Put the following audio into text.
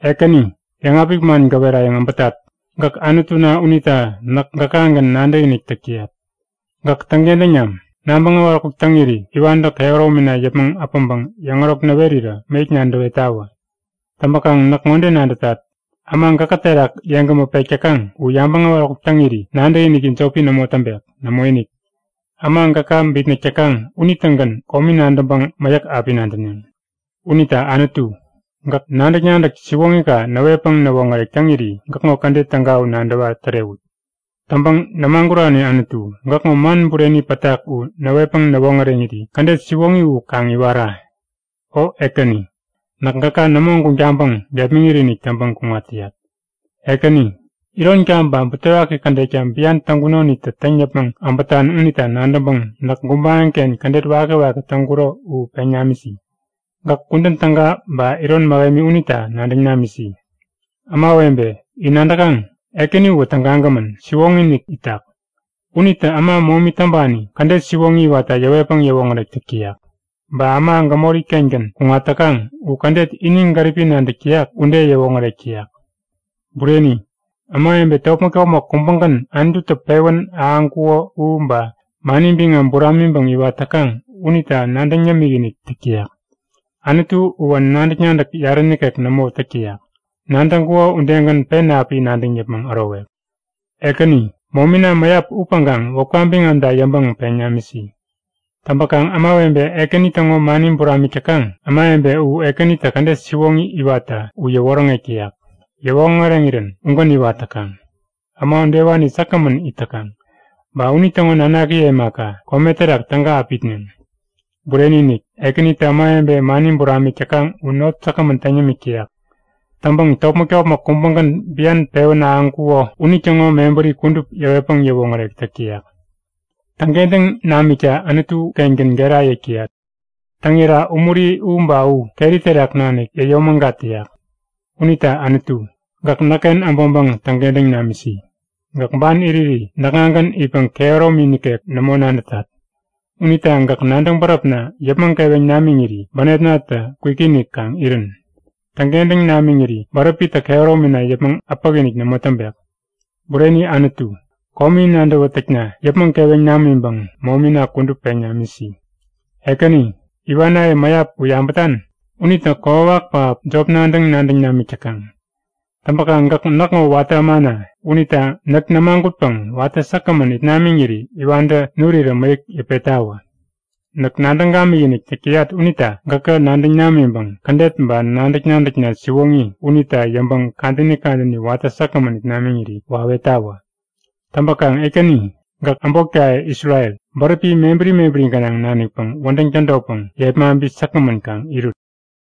Ekäni, yäŋapik man gäwerayäŋ äbätat! Gäk Anutuna unita näk gäkagän nadäkinik täk täyat. Gäk täŋkentäŋ nam! Nabäŋ äwaräkuk täŋiri iwantä kehäromina yäpmäŋ äpäŋpäŋ yäŋärok näwerirä mäyäk nadäwetawä. Täŋpäkaŋ näk ŋode nadätat; Äma gäkä terak yeŋgämä pek täkaŋ u yabäŋ äwaräkuk täŋiri nadäkiniki jopi nämo täŋpek. Nämoinik, äma gäka bitnäk täkaŋ unitägän komi nadäŋpäŋ mäyäk api nadäneŋ. Unita Anutu, gäk nadäk-nadäk siwoŋika näwetpäŋ näwoŋärek täŋiri gäkŋo kädet täga u nadäwa tärewut. Täŋpäŋ nämagurani Anutu, gäkŋo man bureni pätak u näwetpäŋ näwoŋäreŋiri kädet siwoŋi u kaŋ iwara. O Ekäni, näk gäka nämo guŋ taŋpäŋ gepmäŋit-inik täŋpäŋ kuŋat täyat. Ekäni, ironka ba butewaki kädetka bian täŋkunoniktä täŋ yäpmäŋ äbätan unita nadäŋpäŋ näk gubaŋiken kädet wakiwaki täŋkuro u peŋ namisi. Gäk kudän täga ba iron mähemi unita nadäŋ namisi! Ämawebe, in nadäkaŋ? Ekäni uwä tägagämän, siwoŋi-inik itak. Unitä äma momi täŋpani kädet siwoŋi iwatta yäwetpäŋ yäwoŋärek täk täyak. Ba äma gämori-kengän kuŋat täkaŋ u kädet ini gäripi nadäk täyak ude yäwoŋärek täyak. Bureni, ämawebe topmäk-topmäk kubägän Anututä pewän ahäŋkuko u ba mani biŋam buramiŋpäŋ iwat täkaŋ unita nadäŋ yämik-inik täk täyak. Anutu uwä nadäk-nadäk yarä nikek nämo täk täyak, nadäŋkuko udegän pen api nadäŋ yäpmäŋ ärowek. Ekäni, momina mäyap upäŋkaŋ wäpka biŋamta yäŋpäŋ peŋ namisi. Täŋpäkaŋ ämawebe Ekäni täŋo mani buramik täkaŋ, ämawebe u Ekänitä kädet siwoŋi iwatta u yäwoŋärek täyak. Yäwoŋäreŋirän ugän iwat täkaŋ. Äma udewani säkgämän it täkaŋ. Ba unitäŋo nanakiye imaka, kome terak täga api itneŋ. Bureni-inik! Ekänitä ämawebe mani buramik täkaŋ u not säkgämän täŋ yämik täyak. Täŋpäŋ topmäk-topmäk kubägän bian pewän ahäŋkuko unitäŋo mebäri kudup yäwetpäŋ yäwoŋärek täk täyak. Täŋkentäŋ namikta Anutu-kengän gera yäk täyat. Täŋira umuri u ba u keri terak nanik yäyomägat täyak. Unita Anutu, gäk näkken äbäŋpäŋ täŋkentäŋ namisi. Gäk ban iriri näkŋagän itpäŋ kehäromi nikek nämo nadätat. Unita gäk nadäŋ bäräpna yäpmäŋ keweŋ namiŋiri bänepnatä kwikinik kaŋ irän. Täŋkentäŋ namiŋiri bäräpitä kehäromina yäpmäŋ äpäk-inik nämo täŋpek. Bureni Anutu, komi nadäwätäkna yäpmäŋ keweŋ namiŋpäŋ momina kudup peŋ namisi. Ekäni, iwanaye mäyap u yabätan? Unitä kokwawak pähap jop nadäŋ-nadäŋ namik täkaŋ. Täŋpäkaŋ gäk näkŋo watä ämana unita näk nämagutpäŋ watä säkgämän it namiŋiri iwantä nurirä mäyäk yäpettawä. Näk nadäŋ gamikinik täk täyat unita gäkä nadäŋ namiŋpäŋ kädet ba nadäk-nadäkna siwoŋi unita yäŋpäŋ kadäni kadäni watä säkgämän it namiŋiri wawetawä. Täŋpäkaŋ Ekäni, gäk äbotkaye Isrel, bäräpi mebäri mebäri gänaŋ nanikpäŋ wädäŋ tädotpäŋ yepmaŋpi säkgämän kaŋ irut.